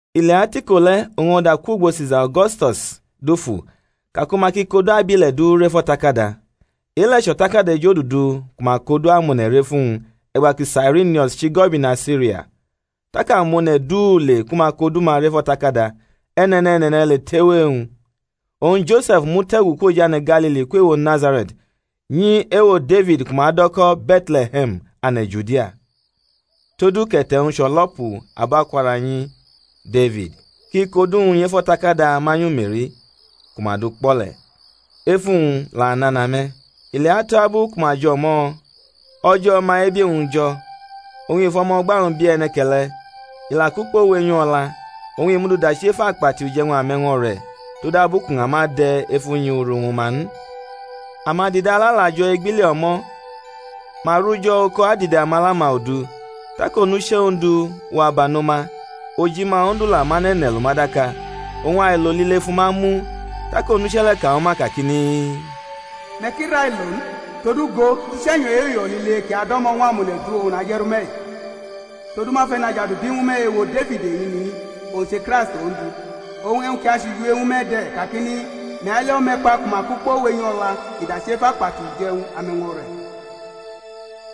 I lewa tʼiko le̩, oñ o̩da kwʼugbo Sisa O̩gosto̩s dufu ka ku ma ki kʼodu abile̩ du rʼef o̩takada. E-le̩ chʼo̩takada ejodudu ku ma kʼodu amone̩ rʼef uwñ e̩gba ku Sairinius chʼigo̩bina Siria. Tak amone̩ du le ku ma kʼodu-ma rʼef o̩takada, e̩ne̩ne̩ne̩ne̩ le tʼewo e-wñ. Oñ Jose̩f mute̩gu kwʼojane̩ Galili kwʼewo Nazare̩t nyi ewo Defid ku ma do̩ ko̩ Be̩tle̩he̩m ane̩ Judia, todu kʼe̩te̩-wñ chʼo̩lo̩pu abo akwo̩ra unyi Defid, kʼi kʼodu-wñ nyʼef o̩takada manyu Me̩ri, ku ma dukpʼo̩ le̩; efu-wñ la nana me̩. I leatu abu ku ma jʼo̩mo̩, o̩jo̩ o̩ma-ebi-wñ jo̩. Oñ i fʼo̩mo̩gba-wñ bi e̩ne̩ke̩le̩; i la kʼukpo wenyʼu o̩la, oñ i mʼu du dachi ef akpati uje̩wñ ame̩wño̩re̩, todabu kʼuña ma de̩ ef unyi uru ñwu ma n. Amadidala la jo̩ egbili o̩mo̩, ma ru jo̩ oko adide amala-ma odu. Tak onuche̩ Ondu wa bano ma, ojima Ondu la mʼane̩ ne̩ lʼuma daka; oñ ailo lile fʼuma mu. Tak onuche̩ le̩ ka ñwu ma kakini, Me̩ ki railo n; todu go, uche̩nyo̩ e-uyo̩ lile ki ado̩mo̩ ñw amone̩ du oñ naje̩rʼume̩-i; todu ma fʼE̩najadu bi ñwu me̩ ewo Defid eñini-i, owñ che Kraist Ondu. Oñ e̩wñ ki achʼujiwe-wñ ñwu me̩ de̩ kakini, Me̩ ali o̩me̩kpa ku ma kʼukpo wenyʼo̩la kʼi la dachi ef akpati uje̩wñ ame̩wño̩re̩.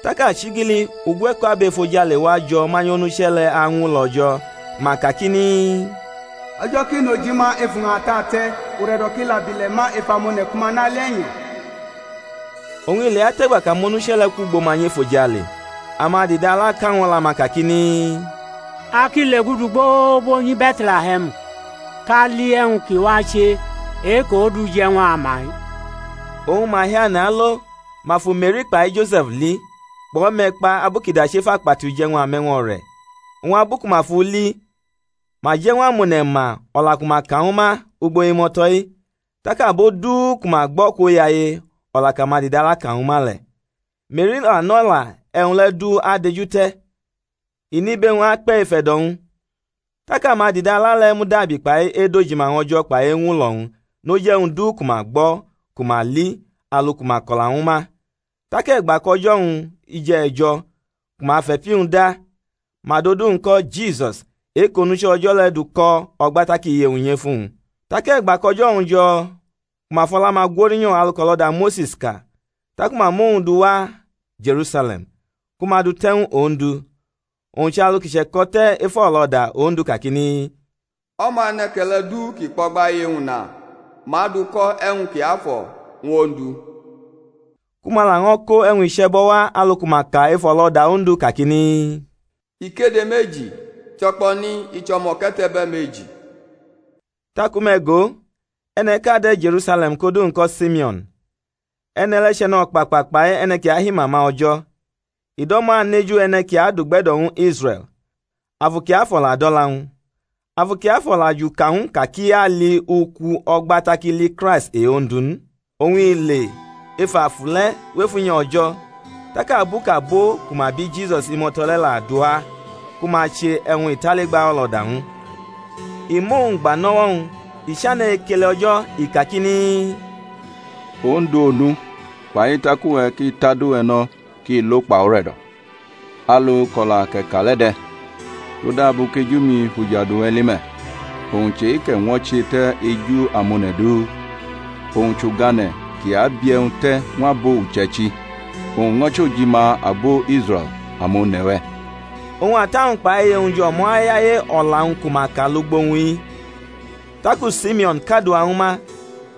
Tak achigili ugwe̩ko̩ abo efojale wajo̩ manyʼonuche̩ le̩ añwulo̩ O̩jo̩, ma kakini, O̩jo̩ ki nʼojima ef uña atate̩, ure̩do̩ ki la bʼile̩ ma ef amone̩ ku ma nʼali e̩nyo̩. Oñ i leatʼe̩gba kʼamonuche̩ le̩ kwʼugbo ma nyʼefojale, amadidala ka ñw o̩la-ma kakini, A ki legudu gbogbo nyi Be̩tle̩he̩m kʼa li e̩wñ ki wache e-kʼOndu je̩ ñw a ma-i. Oñ ma hiane̩ alo, ma fu Me̩ri kpai Jose̩f li, kpʼo̩me̩kpa abu kʼi dachi ef akpati uje̩wñ ame̩wño̩re̩. Oñ abu ku ma fʼu li, ma je̩ ñw amone̩ ma o̩la ku ma ka ñwu ma ugbo imo̩to̩-i. Tak abo du ku ma gbʼo̩ kwoyaye o̩la kʼamadidala ka ñwu ma le̩. Me̩ri la nʼo̩la e̩wñ le̩ du adejute̩, i nʼibe-wñ akpe̩ ef e̩do̩-wñ. Tak amadidala le̩ mudabi kpai edojima ñw O̩jo̩ kpai eñwulo̩-wñ noj e̩wñ du ku ma gbo̩ ku ma li, alu ku ma ko̩la ñwu ma. Tak e̩gba kʼo̩jo̩-wñ jʼe̩jo̩ ku ma fʼe̩pi-wñ da, ma dʼodu-wñ ko̩ Jisus, e-kʼOnuche̩ O̩jo̩ le̩ dʼu ko̩ o̩gba tak iye-wñ nyʼefu-wñ. Tak e̩gba kʼo̩jo̩-wñ jo̩ ku ma fʼo̩la-ma gwo̩rinyo̩ alu kʼo̩lo̩da Mose̩s ka, taku ma mʼowñ duwa Je̩rusale̩m ku ma dʼu te̩ ñw Ondu (owñ chʼalu ki che̩ko̩ te̩ ef o̩lo̩da Ondu kakini, O̩ma e̩ne̩ke̩le̩ du ki kpʼo̩gba iye-wñ na ma aduko̩ E̩wñ kiafo̩ ñw Ondu), ku ma laño̩ ko e̩wñ iche̩bo̩ wa alu ku ma ka ef o̩lo̩da Ondu kakini, Ikede meji, cho̩kpo̩ni i chʼo̩mo̩ke̩te̩be̩ meji. Taku me̩ go, e̩ne̩ʼka de̩ Je̩rusale̩m kʼodu-wñ ko̩ Simeo̩n; e̩ne̩ le̩ chʼe̩no̩kpakpa kpai e̩ne̩ ki ahimama O̩jo̩, i do̩mo̩ aneju e̩ne̩ ki adugbe̩do̩ ñw Israe̩l; Afu Kiafo̩ la dʼo̩la-wñ. Afu Kiafo̩ la juka ñw u ka kʼi ali uku o̩gba tak i li Kraist e-Ondu n. Oñ i le ef Afu le̩ wʼef unyi O̩jo̩; tak abu kʼabo ku ma bi Jisus imo̩to̩ le̩ la dʼu wa ku ma che e̩wñ italigba o̩lo̩da ñw u, i mʼowñ gba nʼo̩wo̩-wñ, i chane̩ ekele O̩jo̩ i kakini, Ondu Onu, fai tak uwe̩ ki tʼadu-we̩ no̩ kʼi lo kpai ure̩do̩ alu kʼo̩la kʼe̩ ka le̩ de̩; todabu kʼeju-mi fʼujadu-we̩ li me̩, owñ chʼe-kʼe̩ ñwo̩che te̩ eju amone̩ du; owñ chʼugane̩ ki abi e̩wñ te̩ ñw abo uche̩ichi, owñ ño̩ chʼojima abo Israe̩l amone̩-we̩. Oñ ata-wñ kpai iye-wñ jʼo̩mo̩ ayaye o̩la-wñ ku ma ka lugbo-wñ-i; taku Simeo̩n kadua ñwu ma,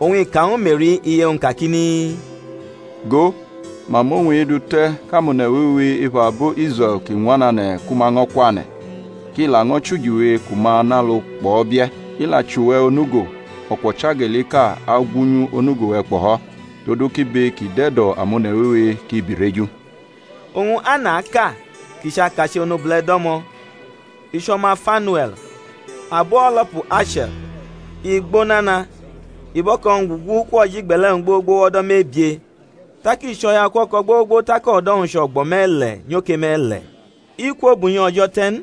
oñ i ka ñwu Me̩ri iye-wñ kakini, Go, ma mʼowñ-i dute̩ kʼamone̩ wewe ef abo Israe̩l ki ñwanane̩ ku ma ño̩ kwane̩; kʼi laño̩ chʼujiwe ku ma nʼalu kpʼo̩ bie̩; i la chʼuwe̩ onugo, o̩kwo̩chageliʼka agwunyu onugo-we̩ kpo̩fo̩; todu kʼibe ki dʼe̩do̩ amone̩ wewe ki birʼeju. Oñ Annaʼka kʼi chʼakache̩ onobule̩ do̩mo̩, i chʼo̩ma Fanue̩l, abo o̩lo̩pu Ashe̩r; (i gbo nana, i bʼo̩ko̩-wñ gugu kwʼojʼigbe̩le̩-wñ gbogbo wʼo̩do̩ mebie, tak i chʼo̩yaukuo̩ko̩ gbogbo tak o̩do̩-wñ chʼo̩gbo̩ me̩le̩ nyoke me̩le̩), i kwo bʼunyi O̩jo̩ te̩ n;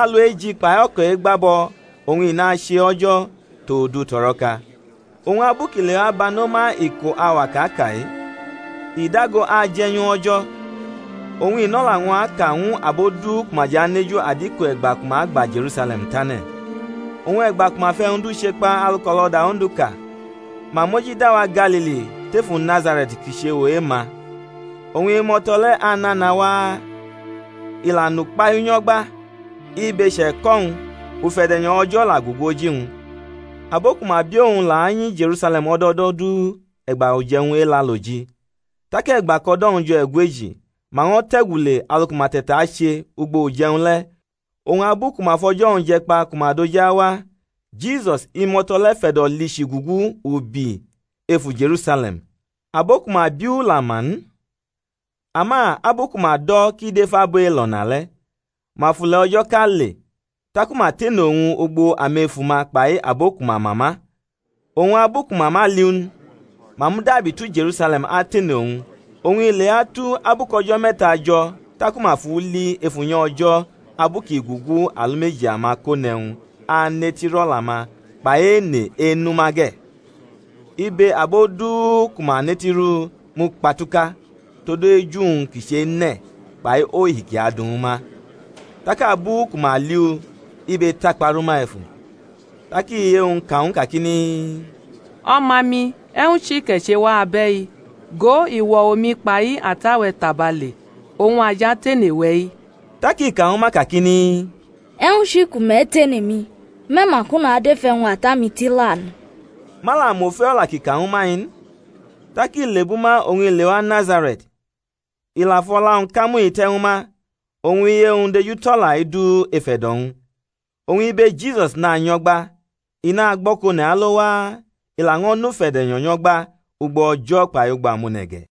alueji kpai o̩ko̩ e̩gbabʼo̩ oñ i nʼache O̩jo̩ tʼodu tʼo̩ro̩ka. Oñ abu kʼi lewa bano ma iko auwa kʼa ka-i, i dago aje̩nyʼO̩jo̩, oñ i nʼo̩la-wñ aka ñw abo du ku ma jʼaneju adiko e̩gba ku ma agba Je̩rusale̩m tane̩. Oñ e̩gba ku ma fʼe̩wñ du chekpa alu kʼo̩lo̩da Ondu ka, ma mojida wa Galili, tefu Nazare̩t ki chʼewo e-ma. Oñ imo̩to̩ le̩ anana waa, i la nʼukpahiu nyo̩gba, ibe che̩ko̩ ñw u, ufe̩de̩nyo̩ O̩jo̩ la gugu oji-wñ. Abo ku ma bi Owñ la nyi Je̩rusale̩m o̩do̩ o̩do̩ du e̩gba uje̩wñ Elaloji. Tak e̩gba kʼo̩do̩-wñ jo̩ e̩gweji, ma ño̩ te̩gu le alu ku ma te̩tache ugbo uje̩wñ le̩; oñ abu ku ma fo̩jo̩-wñ je̩ kpa ku ma doji awa, Jisus, imo̩to̩ le̩ fe̩do̩ lichii gugu ubi efu Je̩rusale̩m; abo ku ma bi u la ma n; ama abu ku ma do̩ kʼi dʼef abo elo̩na le̩, ma fʼule̩ o̩jo̩ʼka le; taku ma tene owñ ugbo amefu-ma kpai abo ku ma ma ma; oñ abu ku ma ma li u n, ma mudabi tu Je̩rusale̩m atene owñ. Oñ i lea tu abu kʼo̩jo̩ me̩ta jo̩ taku ma fʼu li ef unyi O̩jo̩ abu kʼi gugu alumeji amakone̩wñ anetiru o̩la-ma kpai ene enʼuma ge̩. Ibe abo du ku ma netirʼu mukpatuka tod eju-wñ ki chene̩ kpai ohi kʼi adu ñwu ma. Tak abu ku ma li u, ibe takpa rʼuma efu; tak iye-wñ ka ñw u kakini, O̩ma-mi, e̩wñ chi kʼe̩ che wa abe̩i? Go, i wo̩ omi kpai ata-we̩ tabale, oñ a jʼatene we̩-i. Tak i ka ñwu ma kakini, E̩wñ chi ku me̩ tene mi? Me̩ ma ka kʼu nadʼef e̩wñ Ata-mi tila n? Ma la mʼofe o̩la kʼi ka ñwu ma-i n. Tak i lebʼuma oñ i lewa Nazare̩t; i la fʼo̩la-wñ kamuhi te̩ ñwu ma; oñ iye-wñ dejutʼo̩la-i du ef e̩do̩-wñ. Oñ ibe Jisus nanyo̩gba, i nagbʼo̩kone̩ alo waa, i laño̩ nʼufe̩de̩nyo̩ nyo̩gba, ugbo O̩jo̩ kpai ugbo amone̩ ge̩.